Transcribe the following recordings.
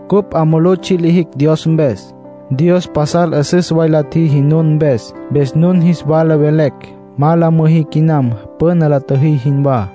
Cupj 'a mulú tsji' lijicj Dios mpes. Dios pasal 'üsüs way la tjiji nun mpes. Mpes nun jis wala velecj ma la müjí quinam püna la tjüjí jinwá.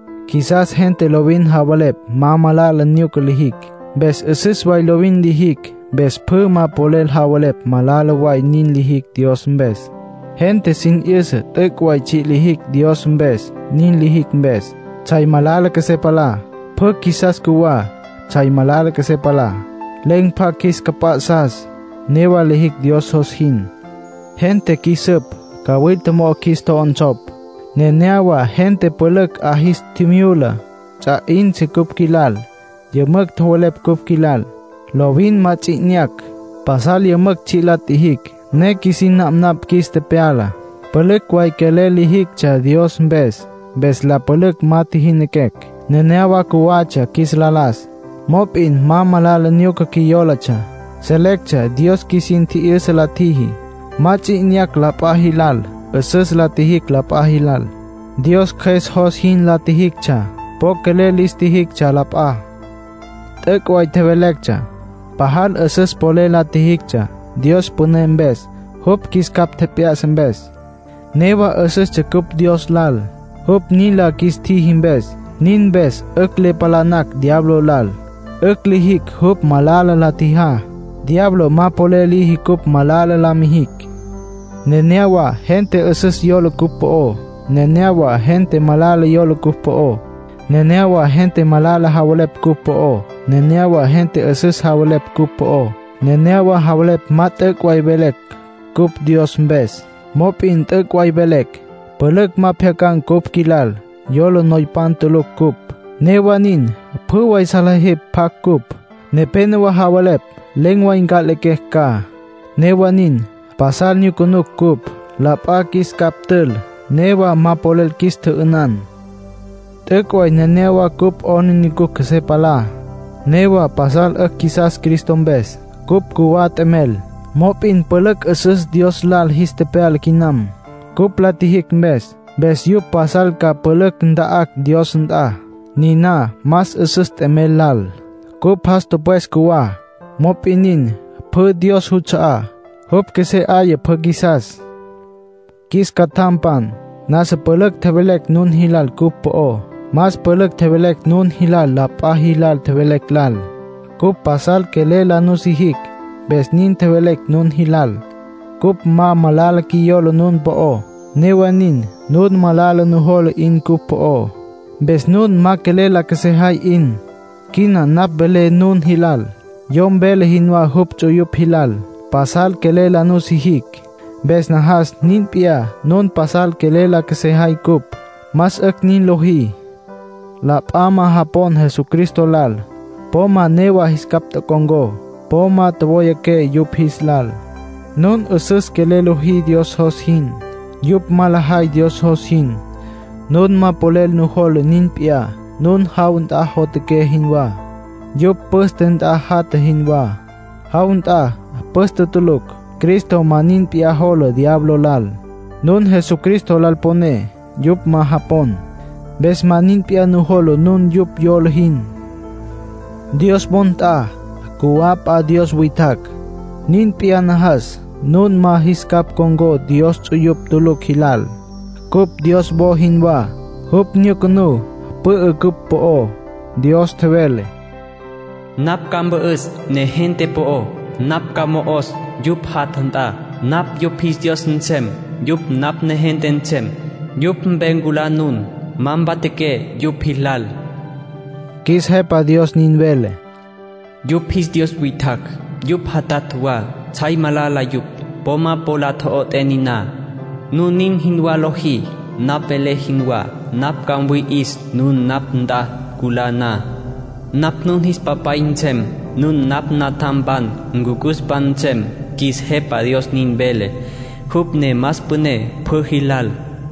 Qjuisas gente lovin javelepj ma malala nyuca lijicj. Mpes 'üsüs way lovin lijicj. Mpes pjü ma polel javelepj malala way nin lijicj Dios mpes. Gente sin 'yüsa t'üc' way tsji' lijicj Dios mpes, nin lijicj mpes. Tsjay malala qjuesé palá. Pjü qjuisas cjuwá. Tsjay malala qjuesé palá, len̈ pjacj qjuis capj p'ya'sá. Newa lijicj Dios jos jin. Gente qjuis süp. Cawilta mo'o qjuis tjo'onsopj. Nenéyawa gente pülücj 'a jis tjimyula, ts'a tji'in cupj qjuilal, yümücj tjowelepj cupj qjuilal. Lovin ma ts'i 'inyacj. Pasal yümücj tsji' la tjijicj, ne qjuisin napnapj qjuis tepyala. Pülücj way quelel lijictsja Dios mpes, mpes la pülücj ma tjijinaquecj. Nenéyawa cjuwatsja qjuis la las. Mop'in ma malala nyuca qjuiyólatsja. Selectsja Dios qjuisin tji'yüsa la tjiji. Ma ts'i tji'inyacj la p'a jilal. 'Üsüs la tjijicj la p'a jilal. Dios Cjües jos jin la tjijictsja. Po quelel lis tjijictsja la p'a. T'üc' way tjevelectsja. Pajal 'üsüs polel la tjijictsja, Dios püné mpes, jupj qjuis capj tjep'ya'sa mpes. Newa 'üsüstsja cupj Dios lal, jupj nin la qjuis tjiji mpes. Nin mpes 'ücj le palanacj diablo lal. 'Ücj lijicj jupj malala la tjijá. Diablo ma polel liji cupj malala la mijicj. Nenéyawa gente 'üsüs yola cupj po'ó. Nenéyawa gente malala yola cupj po'ó. Nenéyawa gente malala javelepj cupj po'ó. Nenéyawa gente 'üsüs javelepj cupj po'ó. Nepénowa javelepj ma t'üc' way velecj cupj Dios mpes. Mop'in t'üc' way velecj. Pülücj ma pjyacan̈ cupj qjuilal, yola noypan tulucj cupj. Newa nin, pjü way salejepj pjacj cupj. Nepénowa javelepj len̈ way nca'lequecj ca. Newa nin, pasal nyucunucj cupj. La p'a qjuis capj tül. Newa ma polel qjuis tjü'ünan. T'üc' way nenéyawa cupj 'aplijila qjuesé palá. Newa pasal 'ücj qjuisas Cristo mpes. Cupj cjuwá t'emel. Mop'in pülücj 'üsüs Dios lal jis tepyala quinam, cupj la tjijicj mpes. Mpes yupj pasal ca pülücj nta'acj Dios nt'a. Niná más 'üsüs t'emel lal. Cupj jas tüpwes cjuwá. Mop'in nin, pjü Dios juts'a'á, jupj qjuesé 'aya pjü qjuisas. Qjuis catjampan, nasa pülücj tjevelecj nun jilal cupj po'ó. Más pülücj tjevelecj nun jilal la p'a jilal tjevelecj lal. Cupj pasal quelel la nusijicj, mpes nin tjevelecj nun jilal. Cupj ma malala qjuiyola nun po'ó. Newa nin, nun malala nujola 'in cupj po'ó, mpes nun ma quelel la qjuesejay 'in. Quina napj velé nun jilal, yom vele jinwá jupj ts'uyupj jilal. Pasal quelel la nusijicj. Mpes najas nin p'iyá nun pasal quelel la qjuesejay cupj. Más 'ücj nin lojí. La p'a ma japon Jesucristo lal, po ma newa jis capj ncon̈có. Po ma tjowayaqué yupj jis lal. Nun 'üsüs quelel lojí Dios jos jin. Yupj ma lajay Dios jos jin, nun ma polel nujola nin p'iyá. Nun jaw nt'a jotjaqué jinwá; yupj püste nt'a jatja jinwá. Jaw nt'a, püste tulucj. Cristo ma nin p'iyá jola diablo lal. Nun Jesucristo lal poné; yupj ma japon. Mpes ma nin p'iyá nujola nun yupj yola jin. Dios wo nt'a, cjuwá p'a dios witjacj. Nin p'iyá, najas nun ma jis capj con̈có Dios ts'uyupj tulucj jilal. Cupj Dios wo jinwá. Jupj nyucunú, pü'ü cupj po'ó. Dios tjevele: “Napj ca mpü'üs negente po'ó. Napj ca mo'os yupj jatja nt'a. Napj yupj jis Dios nsem. Yupj napj negente nsem.” “Yupj mpe culá nun, ma mpatjaqué yupj jilal”, qjuis Jepa Dios nin vele. “Yupj jis dios witjacj, yupj jatatj wa, tsjay malala yupj; po ma po la tjo'ot'é niná. Nun nin jinwá lojí, napj velé jinwá, napj ca mwi'is nun napj nt'a culá na. Napj nun jis Papay nsem. Nun napj natjampan, ncucuspan nsem, qjuis Jepa Dios nin vele, jupj ne más püné pjü jilal.”